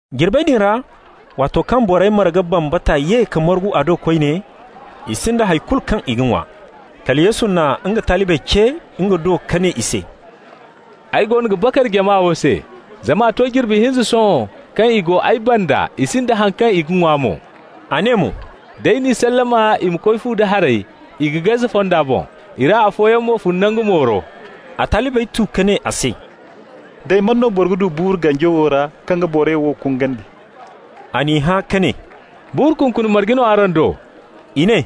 Jirbey din ra, waato kaŋ borey marga bambata ye ka margu a do koyne, i sinda hay kulu kaŋ i ga ŋwa. Kala Yesu na nga talibey ce nga do ka ne i se: «Ay goono ga bakar jama wo se, zama a to jirbi hinza sohõ kaŋ i go ay banda, i sinda haŋ kaŋ i ga ŋwa mo.» A ne mo: «D'ay n'i sallama i ma koy fu da haray, i ga gaze fonda boŋ. I ra afooyaŋ mo fun nangu mooro.» A talibey tu ka ne a se: «Day man no boro ga du buuru ganji wo ra kaŋ ga borey wo kungandi?» A n'i hã ka ne: «Buuru kunkuni marge no araŋ do?» I ne: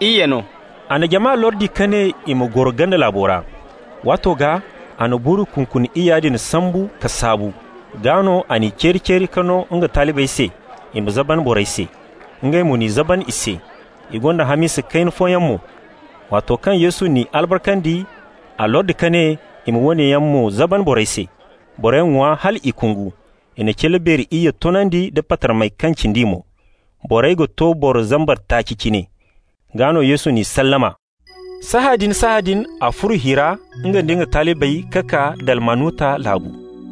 «Iyye no.» A na jama lordi ka ne i ma goro ganda laabo ra. Waato gaa a na buuru kunkuni iyya din sambu ka saabu. Gaa no a n'i ceeri-ceeri ka no nga talibey se i ma zaban borey se. Ngey mo n'i zaban i se. I gonda hamisa kayna fooyaŋ mo. Waato kaŋ Yesu n'i albarkandi, a lordi ka ne i ma woone yaŋ mo zaban borey se. Borey ŋwa hal i kungu. I na cilla beeri iyye toonandi nda patarmey kaŋ cindi mo. Borey ga to boro zambar taaci cine. Gaa no Yesu n'i sallama. Sahãadin-sahãadin a furo hi ra, nga nda nga talibey, ka kaa Dalmanuta laabu.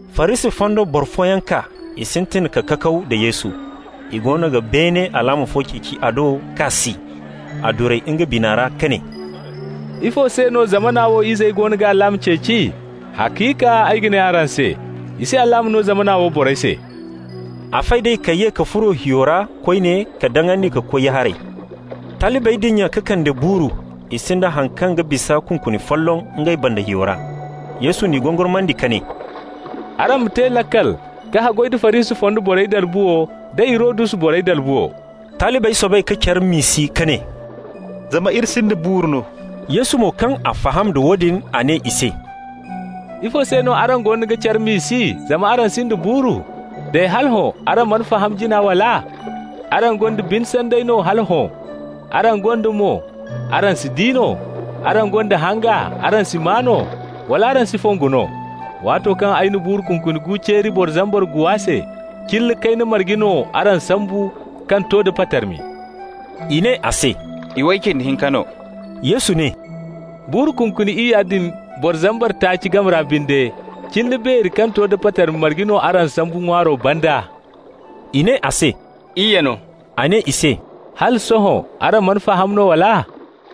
Farisi fonda boro fooyaŋ kaa, i sintin ka kakaw da Yesu. I goono ga beene alaama fo ceeci a do, k'a si. A duray nga biya ra ka ne: «Ifo se no zamana wo izey goono ga alaama ceeci? Haciika ay ga ne araŋ se, i si alaama no zamana wo borey se.» A fay d'ey ka ye ka furo hiyo ra koyne ka daŋandi ka koy ya-haray. Talibey dinya ka kande buuru, i sinda haŋ kaŋ ga bisa kunkuni folloŋ ngey banda hiyo ra. Yesu n'i gongormandi ka ne: «Araŋ ma te laakal ka haggoy nda Farisi fonda borey dalbuwo, da Hirodus borey dalbuwo.» Talibey soobay ka care miisi ka ne: «Zama iri sinda buuru no.» Yesu mo kaŋ a faham da woodin, a ne i se: «Ifo se no araŋ goono ga care miisi zama araŋ sinda buuru? Day, hala hõ araŋ mana faham jina, wala? Araŋ gonda bine sanday no hala hõ? Araŋ gonda mo, araŋ si di no? Araŋ gonda hanga, araŋ si maa no? Wala araŋ si fongu no? Waato kaŋ ay na buuru kunkuni gu ceeri boro zambar guwa se, cilla kayna marge no araŋ sambu kaŋ to da patarmi?» I ne a se: «Iway cindi hinka no.» Yesu ne: «Buuru kunkuni iyya din boro zambar taaci game ra binde, cilla beeri kaŋ to da patarmi marge no araŋ sambu ŋwaaro banda?» I ne a se: «Iyye no.» A ne i se: «Hala sohõ araŋ mana faham no, wala?»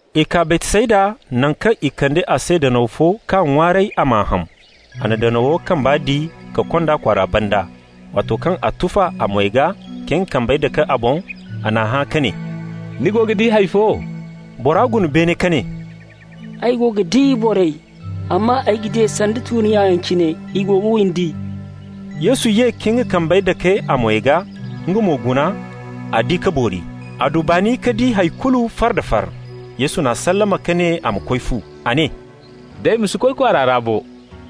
I kaa Baytsayda, naŋ kaŋ i kande a se danaw fo k'a ŋwaaray a m'a ham. A na danawo kamba di ka kond'a kwaara banda. Waato kaŋ a tufa a moy gaa ka nga kambey dake a boŋ, a n'a hã ka ne: «Ni go ga di hay fo?» Bora guna beene ka ne: «Ay go ga di borey, amma ay ga di ey sanda tuuri-nyayaŋ cine, i go ga windi.» Yesu ye ka nga kambey dake a moy gaa; nga mo guna, a di ka boori. A du baani ka di hay kulu far-da-far. Yesu n'a sallama ka ne a ma koy fu. A ne: «Day ma si koy kwaara ra bo.»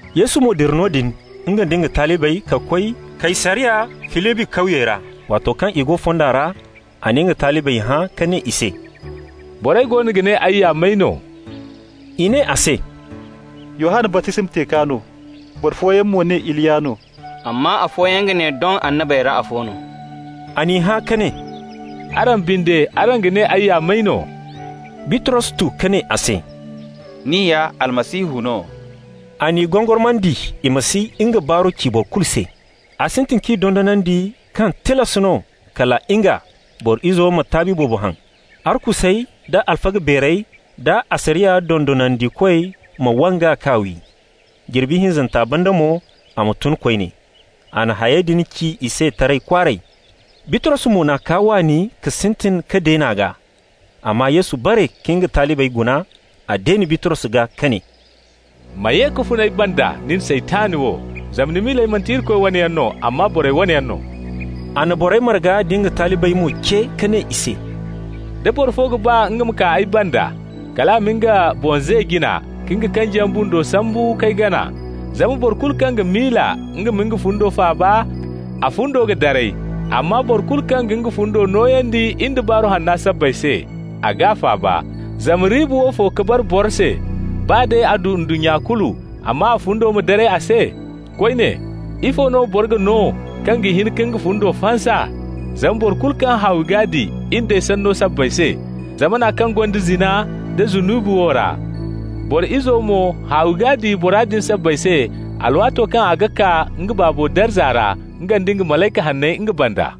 Yesu mo dira noodin, nga nda nga talibey, ka koy Kaysariya Filibi kawyey ra. Waato kaŋ i go fonda ra, a na nga talibey hã ka ne i se: «Borey goono ga ne ay ya may no?» I ne a se: «Yohanna baptisma teekwa no. Boro fooyaŋ mo ga ne Iliya no, amma afooyaŋ ga ne doŋ annabey ra afo no.» A n'i hã ka ne: «Araŋ binde, araŋ ga ne ay ya may no?» Bitros tu ka ne a se: «Ni ya Almasihu no.» A n'i gongormandi i ma si nga baaru ci boro kulu se. A sintin k'i dondonandi kaŋ tilas no kala nga, Boro Izo ma taabi boobo haŋ, arkusey da alfaga beerey da asariya dondonandikoy ma wang'a, k'a wi. Jirbi hinzanta banda mo a ma tun koyne. A na hayey din ci i se taray kwaaray. Bitros mo n'a kaa waani ka sintin ka deen'a gaa. Amma Yesu bare ka nga talibey guna. A deeni Bitros gaa ka ne: «Ma ye ka fun ay banda, nin Saytan wo, zama ni miiley manti Irikoy wane yaŋ no, amma borey wane yaŋ no.» A na borey marga da nga talibey mo ce, ka ne i se: «Da boro fo ga baa nga ma kaa ay banda, kal a ma nga boŋ ze jina, ka nga kanjiyaŋ bundo sambu k'ay gana. Zama boro kulu kaŋ ga miila nga ma nga fundo faaba, a fundo ga daray. Amma boro kulu kaŋ ga nga fundo nooyandi in da Baaru Hanna sabbay se, a g'a faaba. Zama riiba woofo ka bara boro se, baa day a du ndunnya kulu, amma a fundo ma daray a se? Koyne, ifo no boro ga no kaŋ ga hin ka nga fundo fansa? Zama boro kulu kaŋ haawi g'a di in d'ay sanno sabbay se, zamana kaŋ gonda zina nda zunubi wo ra, Boro Izo mo, haawi g'a di bora din sabbay se, alwaato kaŋ a ga kaa nga Baabo darza ra, nga nda malayka hanney nga banda.»